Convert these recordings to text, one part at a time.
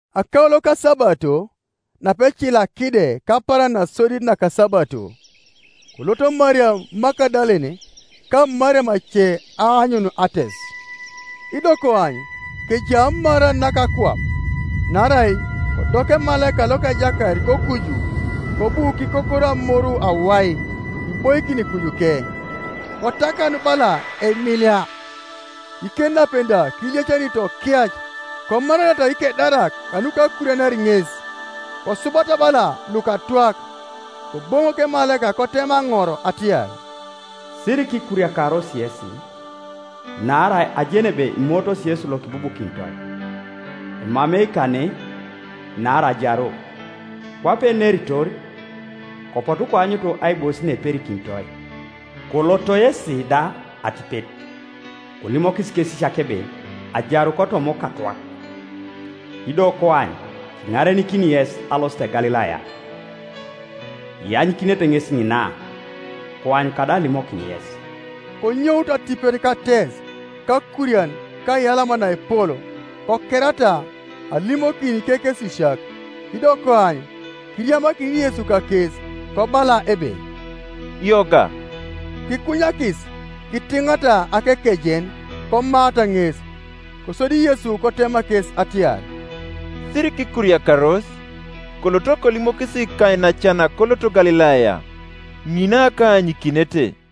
Akaulo kasabato, napecila kide kapaaran nasodit nakasabato, koloto Mariam Magadalene ka Mariam ace aanyun ates. Ido koany, kejai amaran naka akwap; naarai kodok emalaika loka Ejakait kokuju, kobu kikokoro amoru awai, kiboikin kujuke. Kotakanu bala eimilia, ikenapen da kiliacanito kiac. Komaranata ikedarak kanuka akurianar ŋes, kosubata bala lukatwak, Koboŋok emalaika kotema aŋor atiar, “Sirikikuriakaros yesi; naarai ajeni ebe imootos Yesu lokibubukinitoi. Emamei kane; naarai ajaru, kwape eneritor. Kopotu koanyut aibois naeperikinitoi. Koloto yesi da atipet, kolimokis ikekesisiak ebe, ‘Ajaru kotoma okatwak’; ido koany, kiŋarenikini yes alosit Galilaya; ianyikinete ŋes ŋina; koany kadau alimokin yes.” Konyout atipet kates kakurian ka aiyalama naepol, kokerata alimokin ikekesisiak. Ido koany, kiriamakin Yesu kakes, kobala ebe, “Yoga!” Kikunyakis kitiŋata akekejen komaata ŋes. Kosodi Yesu kotema kes ariar, “Sirikikuriakaros; koloto kolimokis ikainacan koloto Galilaya, ŋina kaanyikinete.”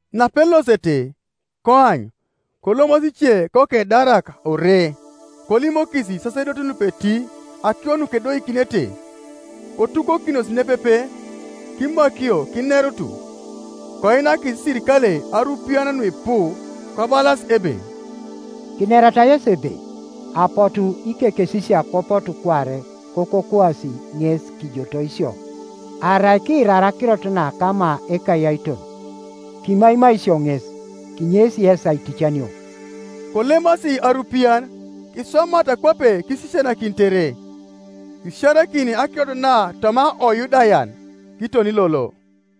Napelosete, koany, kolomasi ice kokedarak ore, kolimokis isasedotin lupeti akiro nukedoikinete, Kotukokinos nepepe kimakio kinerut, koinakis iserikalei arupiyan nuipu, kobalas ebe, “Kinerata yesi ebe, ‘Apotu ikekesisiak kopotu kuare, kokokwasi ŋes kijotoi isio.’ Arai kiirar akirot na kama ekayaiton, kimaimai isio ŋes, kinyeis yes aiticanio.” Kolemasi arupiyan kiswamata kwape kisisianakinitere; kisiarakin akirot na toma oYudayan kiton lolo.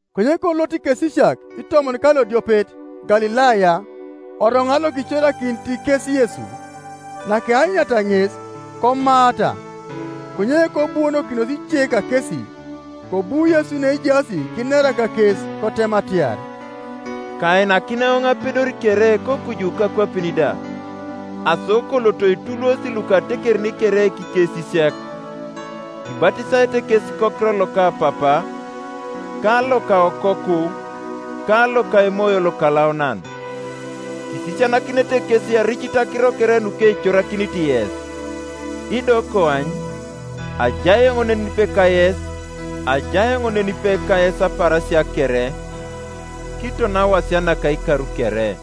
Konye kolot ikesisiak itomon ka lodiopet Galilaya, oroŋat lokicorakinit kes Yesu, Nakeanyuniata ŋes, komaata; konye kobuonokinos ice kakesi. Kobu Yesu neejaas kinera kakes, kotema atiar, “Kainakin eoŋ apedor kere kokuju kakwapin da. Aso kolot kituluosi lukatekerin kere ikesisiak, kibatisaete kes kokiror loka Papa, ka loka Okoku, ka loka Emoyo Lokalaunan; kisisianakinete kes aricit akiro kere nukecorakinit yes; ido koany, ajai eoŋ nenipe kayes apaarasia kere, kiton awasia naka ikar kere,”